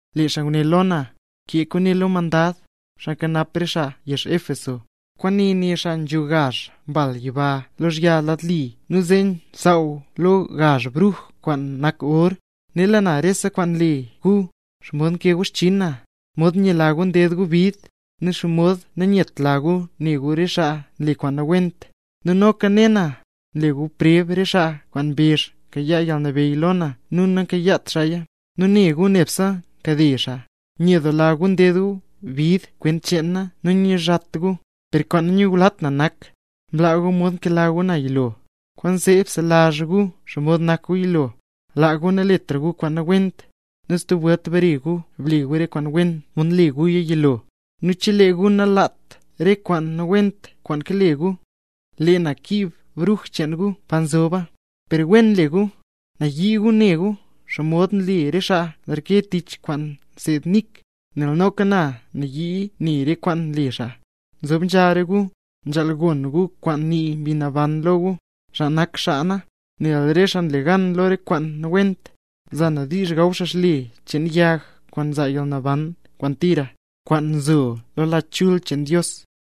Lee xaa nguné lo na: —Kee kwaane lo mandad, xaa nkanap re xaa na yezh Éfeso: “Kwaane né xaa nzho gazh mbal yiba lozhya xaa lad li nu nze xsaww lo gazh bruj kwaan nak or: ‘Nela na rese kwaan nle gu: xomod nkee gu xchinn na, xomod nyela gu nded gu bid, nu xomod nanyetla gu ne gu re xaa nle kwaan nawent. Nu noka ne na, nle gu preb re xaa kwaan mbezh mkayaa yalnabeyy lo na nu namkayaat xaaya, nu ne gu nebse nkade xaa. Nyedoola gu nded gu bid kwent cheen na nu nanyizhat gu. Per kwaan nanyulat na nak mlaa gu mod mkela gu na yilo. Kwaanzee bselazh gu xomod nak gu yilo, laa gu naletra gu kwaan nawent, nu stub welt bare gu ble gu re kwaan wen, mod mle guya yilo. Nu chelee gu nalaat re kwaan nawent kwaan lake gu, lee na kiib bruj cheen gu pa nzoba. Per wen nle gu, nayii gu ne gu xomod nle re xaa nreke tich kwaan nseed Nik, nel noka na nayii ne re kwaan nle xaa. ¡Nzob nzha re gu, nzhaal gon gu kwaan nii Mbi Naban lo gu, xaa nak xaa na! Nel re xaa le gan lo re kwaan nawent, za na diizh gaw xaa xle cheen yag kwaan nzaa yalnaban kwaan tira, kwaan nzo lo Lach Chul cheen Dios.’”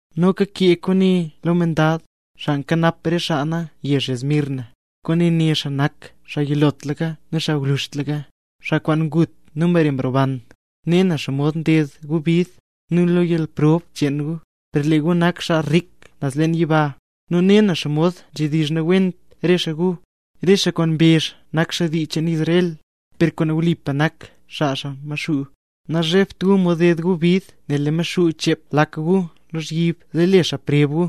’Noka kee kwaane lo mandad, xaa nkanap re xaa na yezh Esmirna: “Kwaane né xaa nak xaa yilotlaka nu xaa gwluzhtlaka, xaa kwaan ngut nu mbare mroban: ‘Ne na xomod nded gu bid, nu yalprob cheen gu, per lee gu nak xaa rik naz leen yiba. Nu ne na xomod nzhedizh nawent re xaa gu, re xaa kwaan mbezh nak xaa dii cheen Israel, per kwaan wlipa nak xaa xaa Maxuu. Nazhebt gu mod ded gu bid nel lee Maxuu chep lak gu lozhyib zee le xaa preb gu;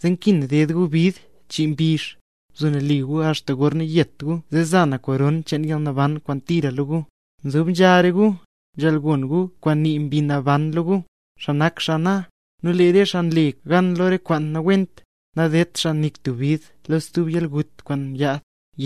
zee nkin ded gu bid chii mbizh. Bzo nali gu axta gorna yet gu zee za na koron cheen yalnaban kwaan tira lo gu. ¡Nzob nzha re gu, nzhaal gon gu kwaan nii Mbi Naban lo gu, xaa nak xaa na! Nu lee re xaa nle gan lo re kwaan nawent, nadedt xaa nik tub bid lo stub yalgut kwaan yaad.’”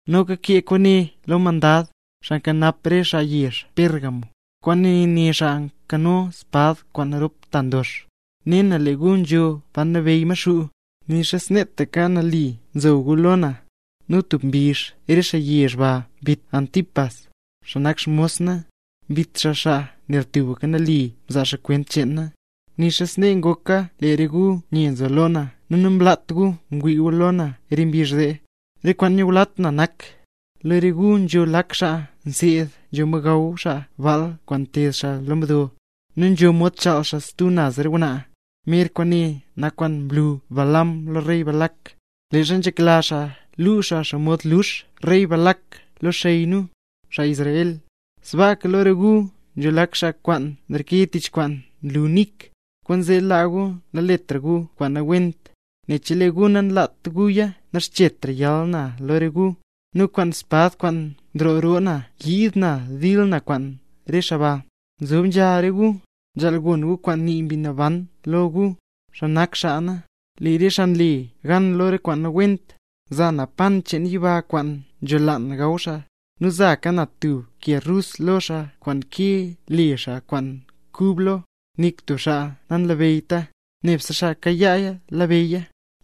’Noka kee kwaane lo mandad, xaa nkanap re xaa na yezh Pérgamo: “Kwaane né xaa nkano espad kwaan rop ta ndox: ‘Ne na lee gu nzho pa nabeyy Maxuu; nixa sneetaka nali nzo gu lo na. Nu tub mbizh re xaa yezh ba mbit Antipas, xaa nak xmos na. Mbit xaa xaa nel tubka nali nzaa xaa kwent cheen na. Nixa snee ngoka lee re gu nye nzo lo na nu namlaat gu mod ngwii gu lo na re mbizh zee. Per kwaan nanyulat na nak: lo re gu nzho lak xaa nseed nzho mod gaw xaa baal kwaan nteed xaa lo mdo, nu nzho mod chaal stub naz re ngwnaa. Mer kwaane nak kwaan mlu Balaam lo rey Balac, leezha nzhekla xaa luu xaa xomod lux rey Balac re xey nu, xaa Israel. Sbaaka lo re gu nzho lak xaa kwaan nreke tich kwaan nlu Nik. Kwaanzee laa gu naletra gu kwaan nawent, nel chelee gu nalaat guya naxchetra yal na lo re gu, nu kwaan espad kwaan nroo roo na yiid na dil na kwaan re xaa baa. ¡Nzob nzha re gu, nzhaal gon gu kwaan nii Mbi Naban lo gu, xaa nak xaa na! Nu re xaa le gan lo re kwaan nawent, za na pan cheen yiba kwaan nzholaan gaw xaa; nu zaka na tub ke rus lo xaa kwaan nkee le xaa kwaan kub lo, nik tub xaa nalabeyyta, nebse xaa kayaaya labeyya.’”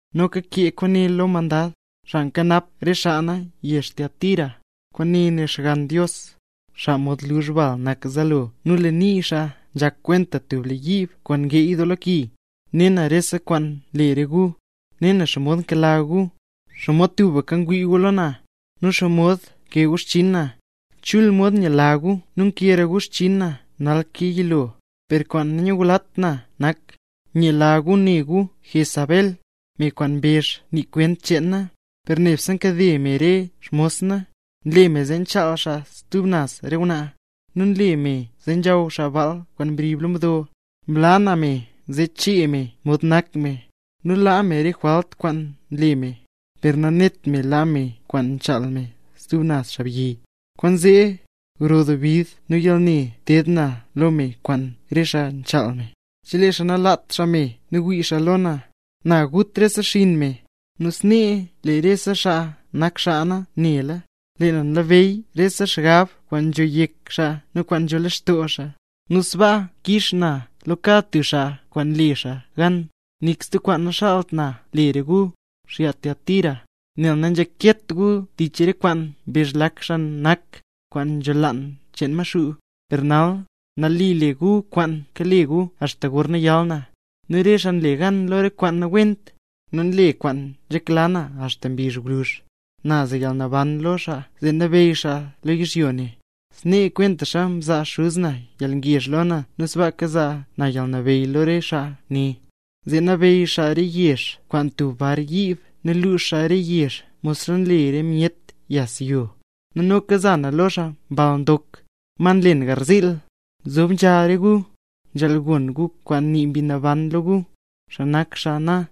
’Noka kee kwaane lo mandad, xaa nkanap re xaa na yezh Tiatira: “Kwaane né Xgann Dios, xaa mod luzh bal nak zaalo, nu lee nii xaa nzhak kwenta tub le yiib kwaan ngeey doo lo ki: ‘Ne na rese kwaan nle re gu; ne na xomod nkela gu, xomod tubka ngwii gu lo na, nu xomod nkee gu xchiin na. Chul mod nyela gu nu nkeera gu xchinn na nal ke yilo. Per kwaan nanyulat na nak: nyela gu ne gu Jezabel, me kwaan mbezh nii kwent cheen na, per nebse nkade me re xmos na, nle me zee chaal xaa stub naz re ngwnaa, nu nle me zee nzhaw xaa baal kwaan mrib lo mdo. Mlaa na me zee chee me mod nak me, nu laa me re jwalt kwaan nle me, per nanet me laa me kwaan nchaal me stub naz xaabyi. Kwaanzee, gro doo bid nu yalne teed na lo me kwaan re xaa nchaal me, chelee xaa nalaat xaa me nu wii xaa lo na, na gut rese xinn me. Nu snee lee rese xaa nak xaa na nela, lee na nlabeyy rese xgab kwaan nzho yek xaa nu kwaan nzho lextoo xaa; nu sbaa kix na lo kad tub xaa kwaan mle xaa gan. Nik stub kwaan naxaalt na le re gu, xaa Tiatira, nel nanzhaket gu tich re kwaan mbezh lak xaa nak, kwaan nzholaan cheen Maxuu. Per nal, nali le gu kwaan kale gu axta gorna yal na. Nu re xaa nle gan lo re kwaan nawent, nu nle kwaan nzhekla na axta mbizh gwluzh, na za yalnabeyy lo xaa zee nabeyy xaa lo yizhyo ne. Snee kwentaxa mzaa Xuz na yalngezh lo na nu sbaaka za na yalnabeyy lo re xaa ne, zee nabeyy xaa re yezh kwaan tub bar yiib nu lux xaa re yezh modxa nlee myet yas yo. Nu noka za na lo xaa Mbal Ndok, ma nlen garziil. ¡Nzob nzha re gu, nzhaal gon gu kwaan nii Mbi Naban lo gu, xaa nak xaa na!’”